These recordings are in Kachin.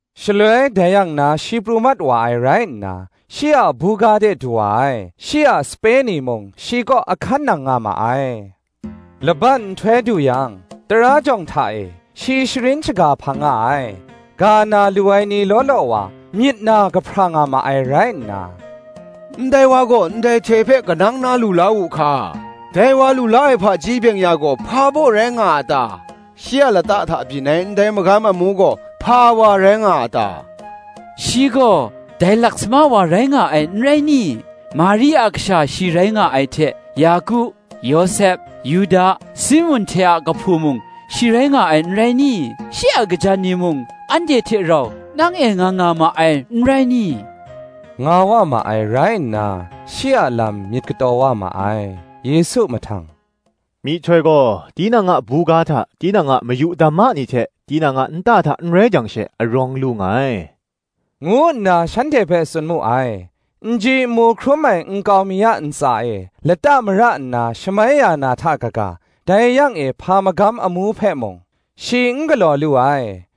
Shaloi dai yang na shi pru mat wa ai rai nna, shi a buga de du wa ai: shi a sape ni mung shi kaw ahkan nang nga ma ai. laban nhtoi du yang, tara jawng hta e, shi sharin shaga hpang nga ai. Ga na lu ai ni law law wa, myit na kahpra nga ma ai rai nna, “Ndai wa gaw, ndai hte hpe kanang na lu la wu hka? Dai wa lu la ai hpaji byeng-ya gaw hpa baw rai nga a ta? Shi a lata hta byin ai, ndai magam amu gaw, hpa wa rai nga a ta? Shi gaw, dai lasama wa rai nga ai, n rai ni? Mari a kasha shi rai nga ai hte, Yaku, Yawsep, Yuda, Simun hte a kahpu mung, shi rai nga ai, n rai ni? Shi a kajan ni mung, anhte hte rau, nang e nga nga ma ai, n rai ni?” nga wa ma ai rai nna, shi a lam myit kataw wa ma ai. Yesu mahtang, “Myihtoi gaw, tinang a buga hta tinang a mayu dama ni hte, tinang a nta hta n rai jang she, arawng lu nga ai, ngu nna shanhte hpe tsun mu ai. N ji n mu hkrum ai nkau mi a ntsa e lata mara nna shamai ya na hta kaga, dai yang e hpa magam amu hpe mung, shi n galaw lu ai.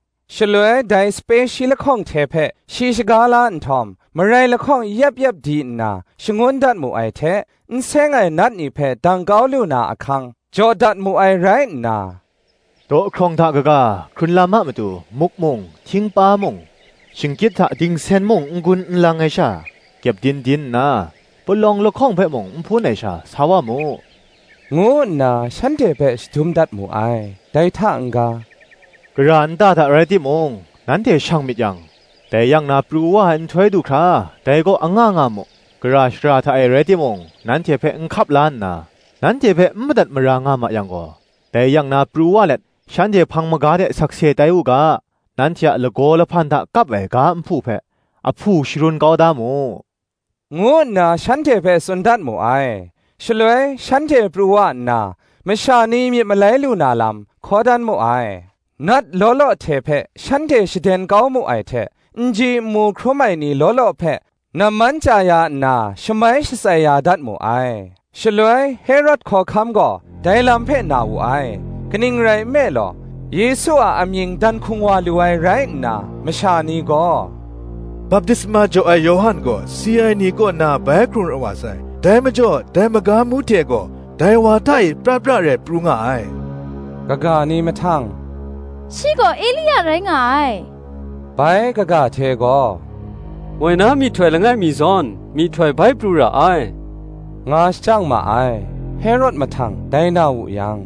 Shaloi dai sape shi lahkawng hte hpe shi shaga la nhtawm, marai lahkawng yep yep di nna, shangun dat mu ai hte, n seng ai nat ni hpe dang kau lu na ahkang, jaw dat mu ai rai nna; dawhkrawng hta kaga, hkrun lam a matu, muk mung, htingpa mung, shingkyit hta dingsen mung, n gun n lang ai sha, kyepdin din nna, palawng lahkawng hpe mung n hpun ai sha, sa wa mu, ngu nna shanhte hpe shadum dat mu ai. Dai hta n-ga, “Gara nta hta rai timung, nanhte shang myit yang, dai yang na pru wa ai nhtoi du hkra, dai kaw anga nga mu. Gara shara hta e rai timung, nanhte hpe n hkap la nna, nanhte hpe n madat mara nga ma yang gaw, dai yang na pru wa let, shanhte hpang maga de sakse tai u ga, nanhte a lagaw lahpan hta kap ai ga nhpu hpe, ahpu sharun kau da mu,” ngu nna shanhte hpe tsun dat mu ai. Shaloi shanhte pru wa nna, masha ni myit malai lu na lam, hkaw dan mu ai: nat law law hte hpe shanhte shaden kau mu ai hte, n ji n mu hkrum ai ni law law hpe namman chya ya nna shamai shatsai ya dat mu ai. Shaloi Herod hkawhkam gaw dai lam hpe na wu ai: kaning rai nme law, Yesu a amying dan hkung wa lu ai rai nna, masha ni gaw, baptisma jaw ai Yawhan gaw si ai ni kaw na bai hkrung rawt wa sai; dai majaw, dai magam amu hte gaw, dai wa hta e pra pra rai pru nga ai; kaga ni mahtang, “Shi gaw, Elia rai nga ai;” bai kaga hte gaw, “Moi na myihtoi langai mi zawn, myihtoi bai pru ra ai,” nga shajang ma ai. Herod mahtang, dai na wu yang,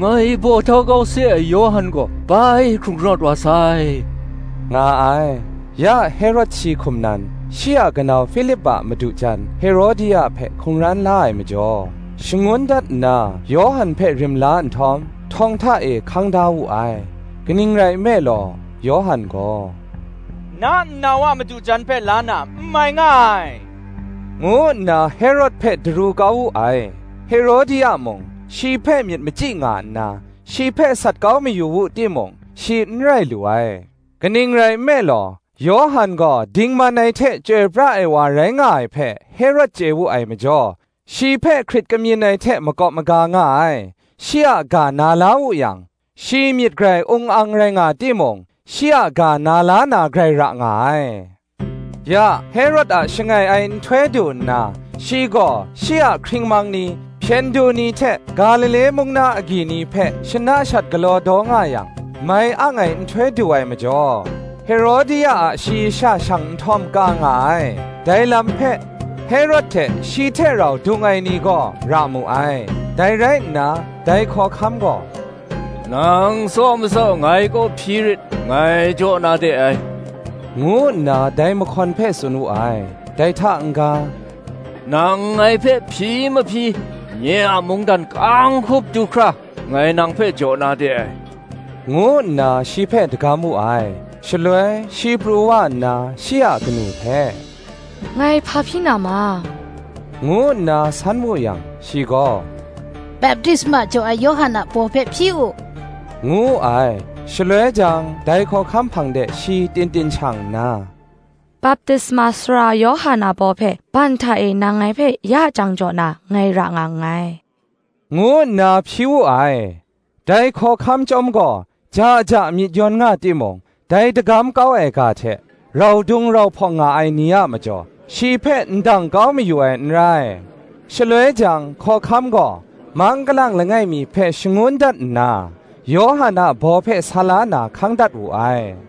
“Ngai baw htau kau se ai Yawhan gaw bai hkrung rawt wa sai,” nga ai. Ya Herod shi hkum nan, shi a kanau Hpilip a madu jan Herodia hpe hkungran la ai majaw, shangun dat nna Yawhan hpe rim la nhtawm, htawng hta e hkang da wu ai. Kaning rai nme law, Yawhan gaw, “Na nnau a madu jan hpe la na, n mai nga ai,” ngu nna Herod hpe daru kau wu ai. Herodia mung shi hpe myit machyi nga nna, shi hpe sat kau mayu wu timung, shi n rai lu ai: kaning rai nme law, Yawhan gaw dingman ai hte chyoi pra ai wa rai nga ai hpe, Herod chye wu ai majaw, shi hpe hkrit kamyin ai hte makawp maga nga ai: shi a ga na la wu yang, shi myit grai ung ang rai nga timung, shi a ga na la na grai ra nga ai. Ya, Herod a shangai ai nhtoi du nna, shi gaw shi a hkringmang ni, hpyen du ni hte Galile mung na agyi ni hpe shana shat galaw daw nga yang: mai ang ai nhtoi du ai majaw, Herodia a shayi sha shang nhtawm ka nga ai: dai lam hpe, Herod hte shi hte rau dung ai ni gaw ra mu ai. Dai rai nna, dai hkawhkam gaw, “Nang tsaw matsaw ngai kaw hpyi rit, ngai jaw na de ai,” ngu nna dai mahkawn hpe tsun wu ai. Dai hta n-ga, “Nang ngai hpe hpyi mahpyi, nye a mungdan ka-ang hkup du hkra, ngai nang hpe jaw na de ai,” ngu nna shi hpe dagam wu ai. Shaloi shi pru wa nna shi a kanu hpe, “Ngai hpa hpyi na ma?” ngu nna san wu yang, shi gaw, “Baptisma jaw ai Yawhan a baw hpe hpyi u,” ngu wu ai. Shaloi jang dai hkawhkam hpang de shi tin tin shang nna, “Baptisma Sara Yawhan a baw hpe, ban hta e nang ngai hpe ya jang jaw na, ngai ra nga nngai,” ngu nna hpyi wu ai. Dai hkawhkam chyawm gaw ja ja myit yawn nga timung, dai dagam kau ai ga hte, rau dung rau hpawng nga ai ni a majaw, shi hpe ndang kau mayu ai n rai. Shaloi jang, hkawhkam gaw, mang galang langai mi hpe shangun dat nna, Yawhan a baw hpe sa la na, hkang dat wu ai.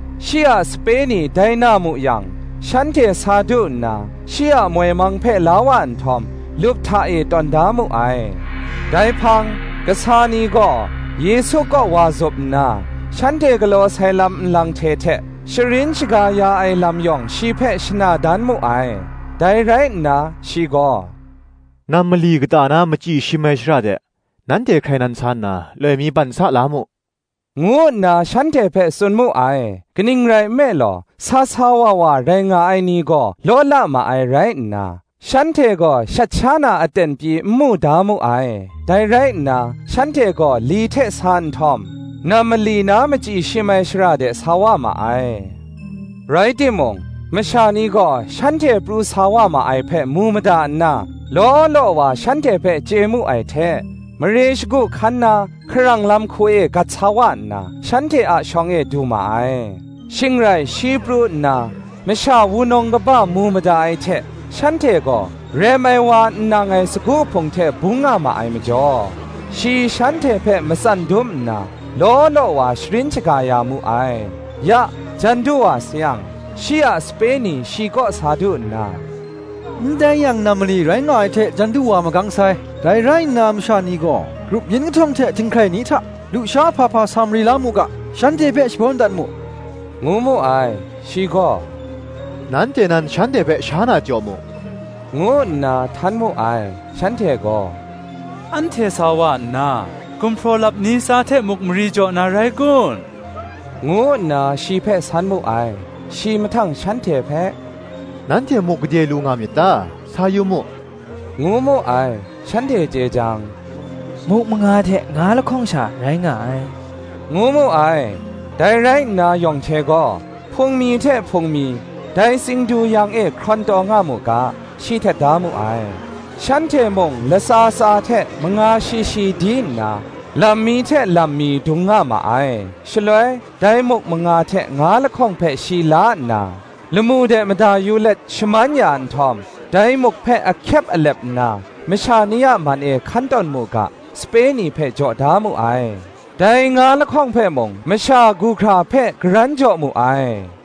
Shi a sape ni dai na mu yang, shanhte sa du nna, shi a moi mang hpe la wa nhtawm, lup hta e tawn da mu ai. Dai hpang, kasa ni gaw Yesu kaw wa zup nna, shanhte galaw sai lam nlang hte hte, sharin shaga ya ai lam yawng shi hpe shana dan mu ai. Dai rai nna shi gaw, “Nam mali kata na machyi shim ai shara de, nanhte hkrai nan sa nna, loi mi ban sa la mu,” ngu nna shanhte hpe tsun mu ai. Kaning rai nme law, sa sa wa wa rai nga ai ni gaw law la ma ai rai nna, shanhte gaw shat sha na aten pyi n mu da mu ai. Dai rai nna, shanhte gaw li hte sa nhtawm nam mali na machyi shim ai shara de sa wa ma ai. Rai timung, masha ni gaw shanhte pru sa wa ma ai hpe mu mada nna, law law wa shanhte hpe chye mu ai hte, mare shagu hkan na hkarang lam hku e gat sa wa nna, shanhte a shawng e du ma ai. Shing rai shi pru nna masha wunawng kaba mu mada ai hte shanhte gaw rem ai wa n nang ai sagu hpung hte bung nga ma ai majaw, shi shanhte hpe matsan dum nna, law law wa sharin shaga ya mu ai. Ya, jan du wa sayang, shi a sape ni shi kaw sa du nna, “Ndai yang nam mali rai nga ai hte jan du wa magang sai: dai rai nna masha ni gaw grup yin kahtawng hte htinghkrai ni hta, lusha hpa hpa sa mari la mu ga, shanhte hpe shabawn dat mu,” ngu mu ai. Shi gaw, “Nanhte nan shanhte hpe sha na jaw mu,” ngu nna htan mu ai. Shanhte gaw, “Anhte sa wa nna, gumhpraw lap ni tsa hte muk mari jaw na rai kun?” ngu nna shi hpe san mu ai. Shi mahtang shanhte hpe, “Nanhte muk gade lu nga myit ta? sa yu mu,” ngu mu ai. Shanhte chye jang, “Muk manga hte nga lahkawng sha rai nga ai,” ngu mu ai. Dai rai nna yawng hte gaw, hpung mi hte hpung mi, dai tsingdu yang e hkrawn taw nga mu ga, shi htet da mu ai. Shanhte mung latsa tsa hte manga shi shi di nna, lam mi hte lam mi, dung nga ma ai. Shaloi dai muk manga hte nga lahkawng hpe shi la nna, lamu de mada yu let shaman ya nhtawm, dai muk hpe ahkyep alep nna, masha ni a man e hkan tawn mu ga, sape ni hpe jaw da mu ai; dai nga lahkawng hpe mung, masha gu hkra hpe karan jaw mu ai.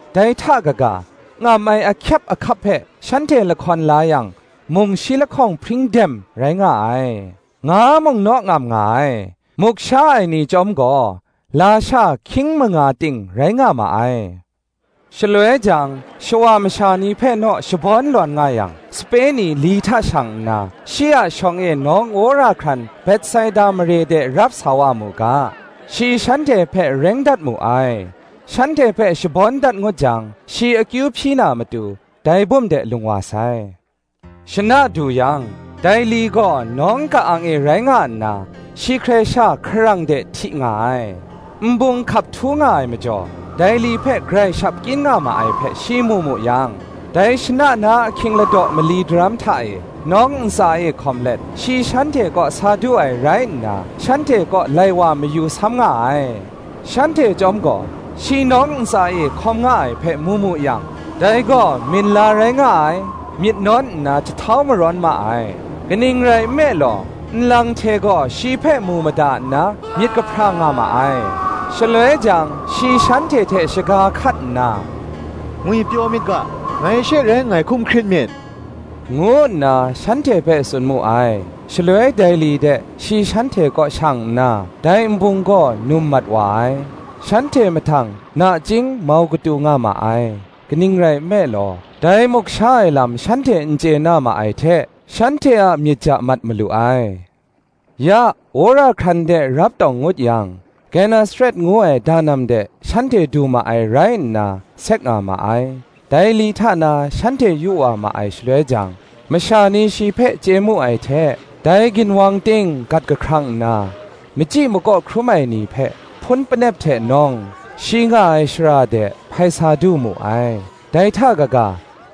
Dai hta kaga, ngam ai ahkyep ahkap hpe shanhte lahkawn la yang, mung shi lahkawng hpring dem rai nga ai: nga mung naw ngam nga ai. Muk sha ai ni chyawm gaw, lasha hkying manga ting rai nga ma ai. Shaloi jang, shawa masha ni hpe naw shabawn nga yang, sape ni li hta shang nna, shi a shawng e nawng wora hkran Betsaida mare de rap sa wa mu ga, shi shanhte hpe reng dat mu ai. Shanhte hpe shabawn dat ngut jang, shi akyu hpyi na matu, dai bum de lung wa sai. Shana du yang, dai li gaw nawng ka-ang e rai nga nna, shi hkrai sha hkarang de hti nga ai. Nbung hkap htu nga ai majaw, dai li hpe grai shap kyin nga ma ai hpe, shi mu mu yang, dai shana na ahkying ladaw mali daram hta e, nawng ntsa e hkawm let, shi shanhte kaw sa du ai rai nna, shanhte kaw lai wa mayu sam nga ai. Shanhte chyawm gaw, shi nawng ntsa e hkawm nga ai hpe, mu mu yang, dai gaw minla rai nga ai, myit nawn nna jahtau marawn ma ai: kaning rai nme law, nlang hte gaw shi hpe mu mada nna myit kahpra nga ma ai. Shaloi jang, shi shanhte hte shaga hkat nna, “Ngwipyaw myit ga: ngai she rai nngai; hkum hkrit myit,” ngu nna shanhte hpe tsun mu ai. Shaloi dai li de, shi shanhte kaw shang nna, dai nbung gaw num mat wa ai. Shanhte mahtang nachying mau katu nga ma ai: kaning rai nme law, dai muk sha ai lam shanhte n chye na ma ai hte, shanhte a myit ja mat malu ai. Ya, wora hkran de rap tawng ngut yang, Genesaret ngu ai danam de shanhte du ma ai rai nna, sek nga ma ai. Dai li hta na shanhte yu wa ma ai shaloi jang, masha ni shi hpe chye mu ai hte, dai ginwang ting gat kahkrang nna, machyi makaw hkrum ai ni hpe, hpun panep hte nawng, shi nga ai shara de, hpai sa du mu ai. Dai hta kaga,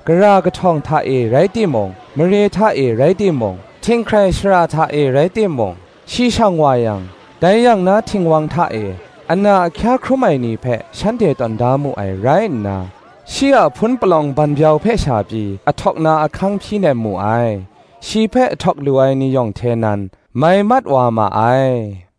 gara kahtawng hta e rai timung, mare hta e rai timung, htinghkrai shara hta e rai timung, shi shang wa yang, dai yang na htingwang hta e, ana ahkya hkrum ai ni hpe shanhte tawn da mu ai rai nna, shi a hpun palawng banbyau hpe sha pyi ahtawk na ahkang hpyi nem mu ai: shi hpe ahtawk lu ai ni yawng hte nan, mai mat wa ma ai.